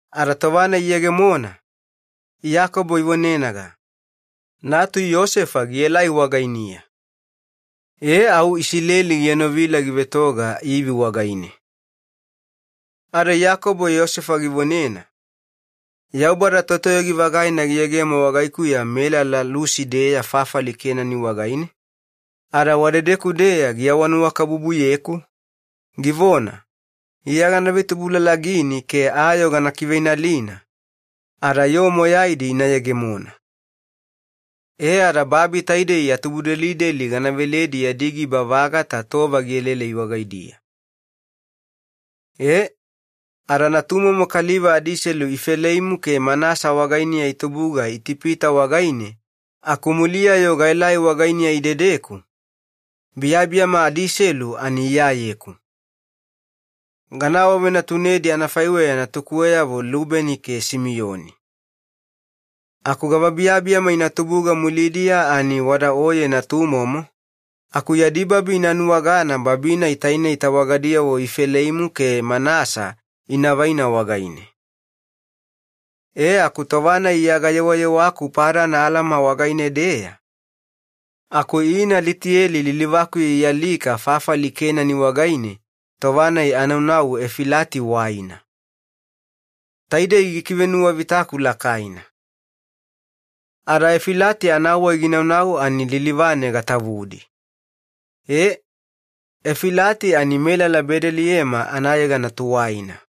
Ada tova-nai iyegemona, Iyakobo ivonenaga, “Natu Yosefa gielai wagainiya,” au Iyakobo gienovila givetoga ivi wagaine. Ada Iyakobo Yosefa givonena, “Yaubada Totoyogi-vagaina giyegemo wagaikuya melala Lusi-deya fafali Kenani wagaine, ada wadedeku-deya giawanuwakabubuyeku, givona, ‘Iya gana ivetubulalagini ke ayoo gana kiveinalina ada yoo moyaidi ina yegemona. E ada babi taidei ya tubudelideli gana veledi yadi giba vagata tova gielaelai wagaidiya.’ E, ada natumomo kaliva adiselu Ifeleimu ke Manasa wagainiya itubuga Itipita wagaine aku muliya-yo gaelai wagainiya idedeku, biyabiyama adiselu ani iyayeku, gana awavenatunedi anafaiweya natukuweyavo Lubeni ke Simiyoni. Aku gava biyabiyama ina tubuga mulidiya ani wada oyeni, aku yadi babi ina nuwagana babi-nai tainei tawagadiyavo Ifeleimu ke Manasa inavaina wagaine. E aku tova-nai iya gayewayewaku Padan Alama wagaine-deya aku ina Litiyeli lilivakuya ialika fafali Kenani wagaine tova-nai anaunau Efilati waina. Taidei gikivenuwavitaku lakaina. Ada Efilati anawai ginaunau ani lilivane gatavudi.” E, Efilati ani melala Bedeliyema anayegana tuwaina.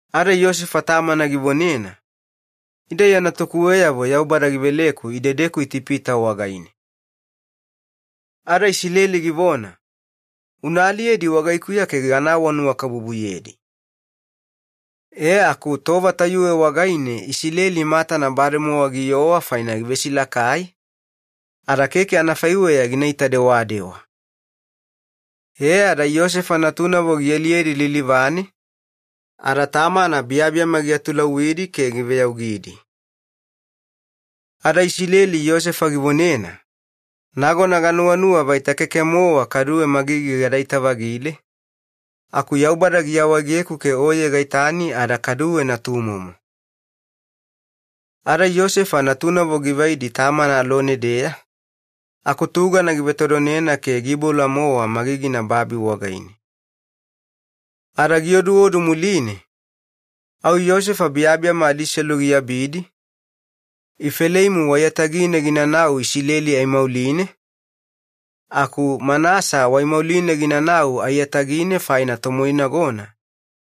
Ada Yosefa tamana givonena, “Ida iya natukuweyavo Yaubada giveleku idedeku Itipita wagaine.” Ada Isileli givona, “Una aliyedi wagaikuya ke gana awanuwakabubuyedi.” E aku tova tayuwe wagaine Isileli matana bademowa giowa faina givesilakai, ada keke anafaiweya gina itadewadewa. E ada Yosefa natunavo gialiyedi lilivane ada tamana biyabiyama giatulauwidi ke giveyaugidi. Ada Isileli Yosefa givonena, “Nagona ganuwanuwa vaita keke-mowa kaduwe magigi gadaita-vagile, aku Yaubada giawaegeku ke oye gaitani ada kaduwe natumomo.” Ada Yosefa natunavo givaidi tamana alone-deya aku tugana givetodonena ke giiboula-mowa magigina babi wagaine. Ada gioduodu muline au Yosefa biyabiyama adiselu giabidi, Ifeleimu waiyatagine ginanau Isileli aimauline, aku Manasa waaimauline ginanau aiyatagine faina tomoinagona,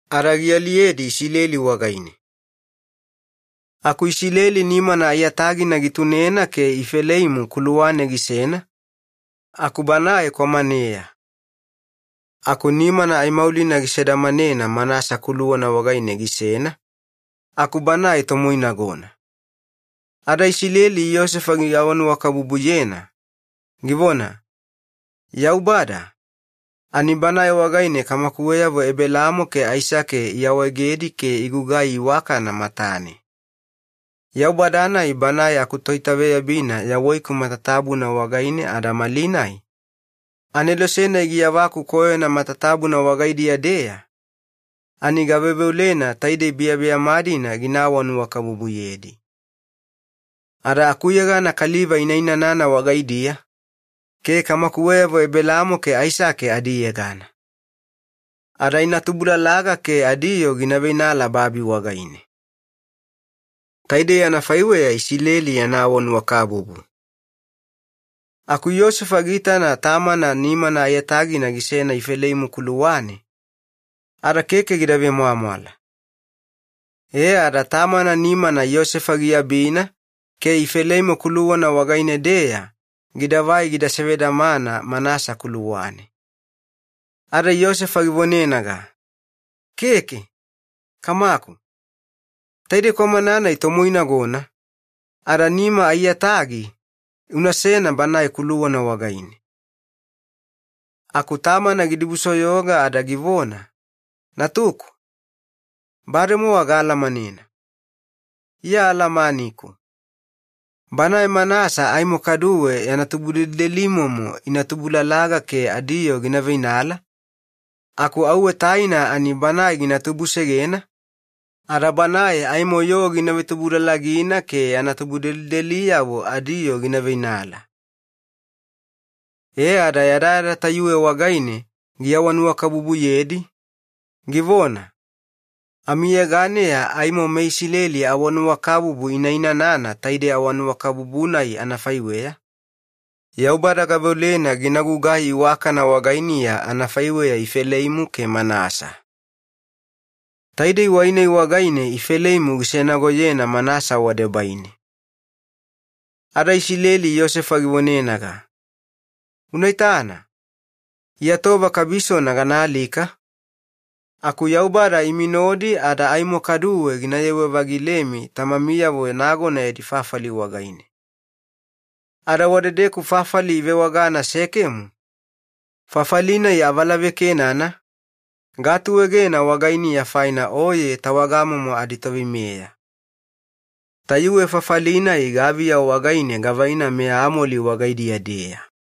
ada gialiyedi wagaine. Aku Isileli nimana aiyatagina gitunena ke Ifeleimu kuluwane gisena, aku banae kwamaneya. Aku nimana aimaulina gisedamanena Manasa kuluwana wagaine gisena, aku banae tomoinagona. Ada Isileli Yosefa giawanuwakabubuyena ke givona, “Yaubada, ani Banae wagaine kamakuweyavo Ebelaamo ke Aisake iawaegedi ke igugai iwakana matane. Yaubada-nai Banae akutoitaveyabina yawaiku matatabuna wagaine ada malinai, Anelose-nai giyavaku koyona matatabuna wagaidiya-deya, ani gaveoveolena taidei biyabiyama-dina gina awanuwakabubuyedi. Ada akuyegana kaliva ina inanana wagaidiya, ke kamakuweyavo Ebelaamo ke Aisake adiyegana. Ada ina tubulalaga ke adiyoo gina veinala babi getane.” Taidei anafaiweya Iyakobo yana awanuwakabubu. Aku Yosefa giitana tamana nimana aiyatagina gisena Ifeleimu kuluwane ada keke gida vemwamwala, e ada tamana nimana Yosefa giabina ke Ifeleimu kuluwana wagaine-deya gidavai gida sevedamana Manasa kuluwane. Ada Yosefa givonenaga, “Keke, kamaku. Taidei kwamana-nai tomoinagona, ada nima aiyatagi unasena banae kuluwana wagaine.” Aku tamana gidibusoyoga ada givona, “Natuku, bademowa gaalamanena, iya alamaniku. Banae Manasa aimo kaduwe yana tubudelidelimomo ina tubulalaga ke adiyoo gina veinala, aku auwe anatubuluga kwamaneya banae gina tubusegena, ada banae aimo yoo gina vetubulalagina ke yana tubudelideliyavo adiyoo gina veinala.” E ada yadayada tayuwe wagaine giawanuwakabubuyedi, givona, “Amiyeganeya aimo meIsileli awanuwakabubu ina inanana taidei awanuwakabubu-nai anafaiweya, ‘Yaubada gaveolena gina gugai iwakana wagainiya anafaiweya Ifeleimu ke Manasa.’” Taidei wai-nai wagaine Ifeleimu gisenagoyena Manasa wadebaine. Ada Isileli Yosefa givonenaga, “Unaitana, iya tova kabisona ganaalika, aku Yaubada imi nodi ada aimo kaduwe gina yewe-vagilemi tamamiyavo nagona yadi fafali wagaine. Ada wadedeku fafali ivewagana Sekemu, fafali-nai avalavekenana, gaatuegena wagainiya faina oye tawagamomo aditoveimeya. Tayuwe fafali-nai gaviyeya gavaina meAmoli wagaidiya-deya.”